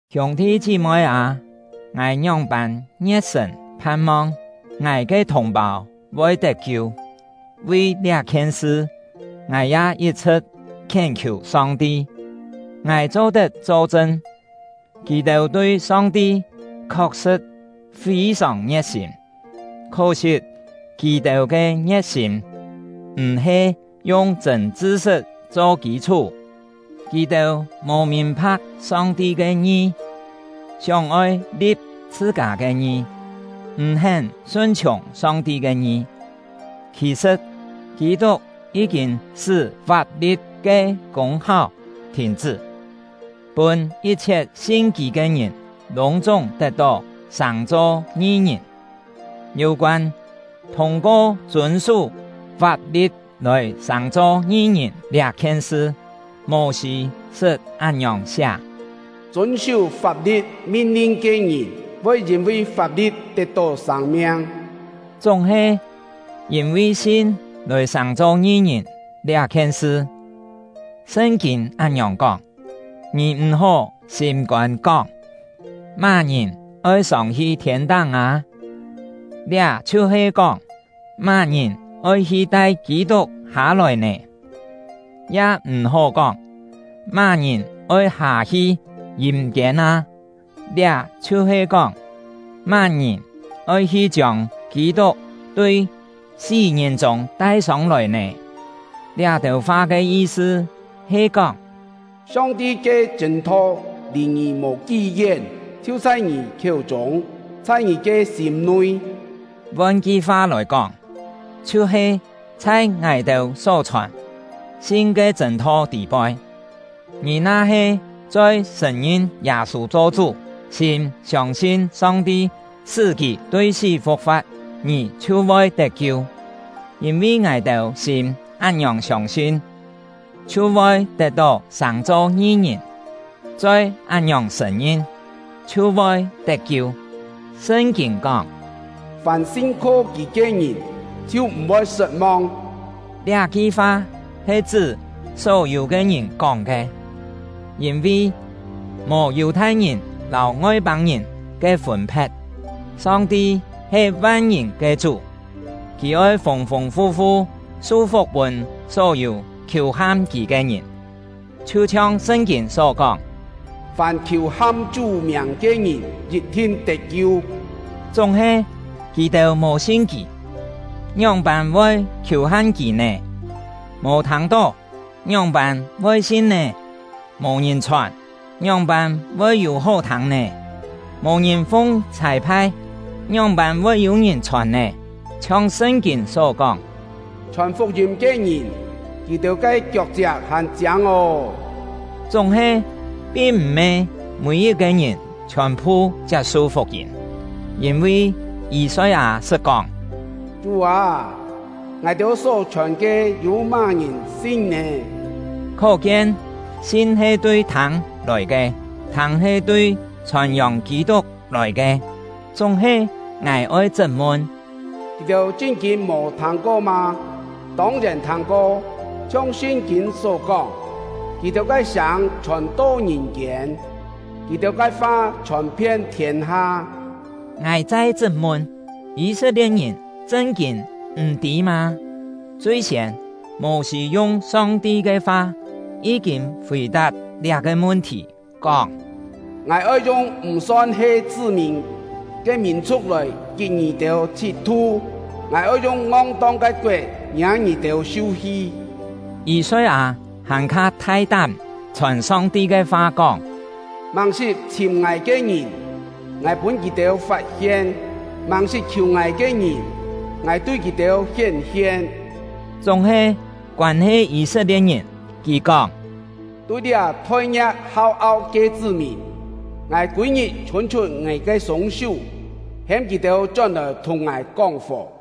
Hiûng-thi chí-moi â, ngài ngióng-pân ngie̍t-sṳ̀n phan-mong ngài ke thùng-pâu voi tet-kiu; vi liá-khien sṳ, ngài ya yit-chhṳ̍t khién-khiù Song-ti! Ngài cho-tet cho-chṳn, kì-têu tui Song-ti khok-sṳ̍t fî-sòng ngie̍t-sîm, khó-sit kì-têu ke ngie̍t-sîm m̀-he yung chṳ̂n chṳ-sṳt cho kî-chhú. Kì-têu mò mìn-pha̍k Song-ti ke ngi, sióng-oi li̍p chhṳ-kâ ke ngi, m̀ hén sun-chhiùng Song-ti ke ngi. Khì-sṳ̍t, Kî-tuk yí-kîn sṳ́ fap-li̍t ke kûng-háu thìn-chṳ́, pûn yit-chhiet sin kì ke ngìn lûng-chúng tet-tó sàng-cho ngi-ngìn. Yû-koân thûng-ko chûn-sú fap-li̍t lòi sàng-cho ngi-ngìn liá-khien sṳ, Mô-sî sṳt án-ngiòng siá: “Chûn-sú fap-li̍t min-lin ke ngìn, voi yîn-vi fap-li̍t tet-tó sâng-miang.” Chúng-he, yîn-vi sin lòi sàng-cho ngi-ngìn liá-khien sṳ, Sṳn-kîn án-ngiòng kóng: “Ngì m̀-hó sîm-kôn kóng: Má-ngìn oi sông-hi thiên-táng â?” (Liá chhiu-he kóng, má-ngìn oi hi tai Kî-tuk hâ-lòi nè?) “Ya m̀-hó kóng: Má-ngìn oi hâ-hi yîm-kiên â?” (Liá chhiu-he kóng, má-ngìn oi hi chiông Kî-tuk tui sí-ngìn-chûng tai sông-lòi nè?) Liá-têu fa ke yi-sṳ he kóng: “Song-ti ke chṳ̂n-tho lì ngì mò kí-yén, chhiu chhai ngì khiéu-chûng, chhai ngì ke sîm-nui.” Von ki-fa lòi kóng, chhiu-he chhai ngài-têu só chhòn “sin ke chṳ̂n-tho” tî-poi. Ngì na-he choi sṳ̀n-ngin Yâ-sû cho Chú, sîm siông-sin Song-ti sṳ́ kì tui sí fu̍k-fa̍t, ngì chhiu voi tet-kiu. Yîn-vi ngài-têu sîm án-ngiòng siông-sin, chhiu voi tet-tó sàng-cho ngi-ngìn; choi án-ngiòng sṳ̀n-ngin, chhiu voi tet-kiu. Sṳn-kîn kóng: “Fàm sin-kho Kì ke ngìn chhiu m̀-voi sṳt-mong.” Liá-ki fa he chṳ́ só-yû ke ngìn kóng ke, yîn-vi mò Yù-thai-ngìn lâu Ngoi-pâng-ngìn ke fûn-phe̍t; Song-ti he van-ngìn ke Chú, Kì oi fûng-fûng fu-fu su-fuk pûn só-yû khiù-ham Kì ke ngìn. Chhiu-chhiong Sṳn-kîn só kóng: “Fàm khiù-ham Chú miàng ke ngìn yit-thin tet-kiu.” Chúng-he, kì-têu mò sin Kì, ngióng-pân voi khiù-ham Kì nè? Mò thâng-tó, ngióng-pân voi sin nè? Mò ngìn chhòn, ngióng-pân voi yû-hó thâng nè? Mò ngìn fung chhâi-phai, ngióng-pân voi yû ngìn chhòn nè? Chhiong Sṳn-kîn só kóng: “Chhòn fuk-yîm ke ngìn, kì-têu ke kiok-chiak hàn chiâng ô!” Chúng-he, pin m̀-he mî-yit-ke ngìn chhiòn-phu chiap-su fuk-yîm, yîn-vi Yî-soi-â sṳt kóng: “Chú â, ngài-têu só-chhòn ke, yû má-ngìn sin nè?” Khó-kien, sin he tui thâng lòi ke, thâng he tui chhòn-yòng Kî-tuk lòi ke. Chúng-he, ngài oi chṳt-mun: Kì-têu chṳn-kîn mò thâng-ko mâ? Tông-yèn thâng-ko! Chhiong Sṳn-kîn só kóng: Kì-têu ke sâng chhòn-to ngìn-kiên; kì-têu ke fa chhòn-phien thiên-ha. Ngài chai chṳt-mun: Yî-set-lie̍t-ngìn chṳn-kîn m̀-tî mâ? Chui-siên, Mô-sî yung Song-ti ke fa yí-kîn fì-tap liá-ke mun-thì, kóng: Ngài oi yung ‘m̀ son-he chṳ́-mìn’ ke mìn-chhu̍k lòi kit ngì-têu chhit-tu, Ngài oi yung ngong-tong ke koet ngiâ ngì-têu su-hi. Yî-soi-â hàn-kha thai-tám chhòn Song-ti ke fa kóng: Màng-sṳt chhìm Ngài ke ngìn, Ngài pûn kì-têu fat-hien, màng-sṳt khiù Ngài ke ngìn, Ngài tui kì-têu hién-hien. Chúng-he, koân-he Yî-set-lie̍t-ngìn, Kì kóng: Tui liá phoi-ngia̍k hau-au ke chṳ́-mìn, Ngài kûi-ngit chhûn-chhut Ngài ke sûng-sú, hêm kì-têu chón-lòi thùng Ngài kóng-fò.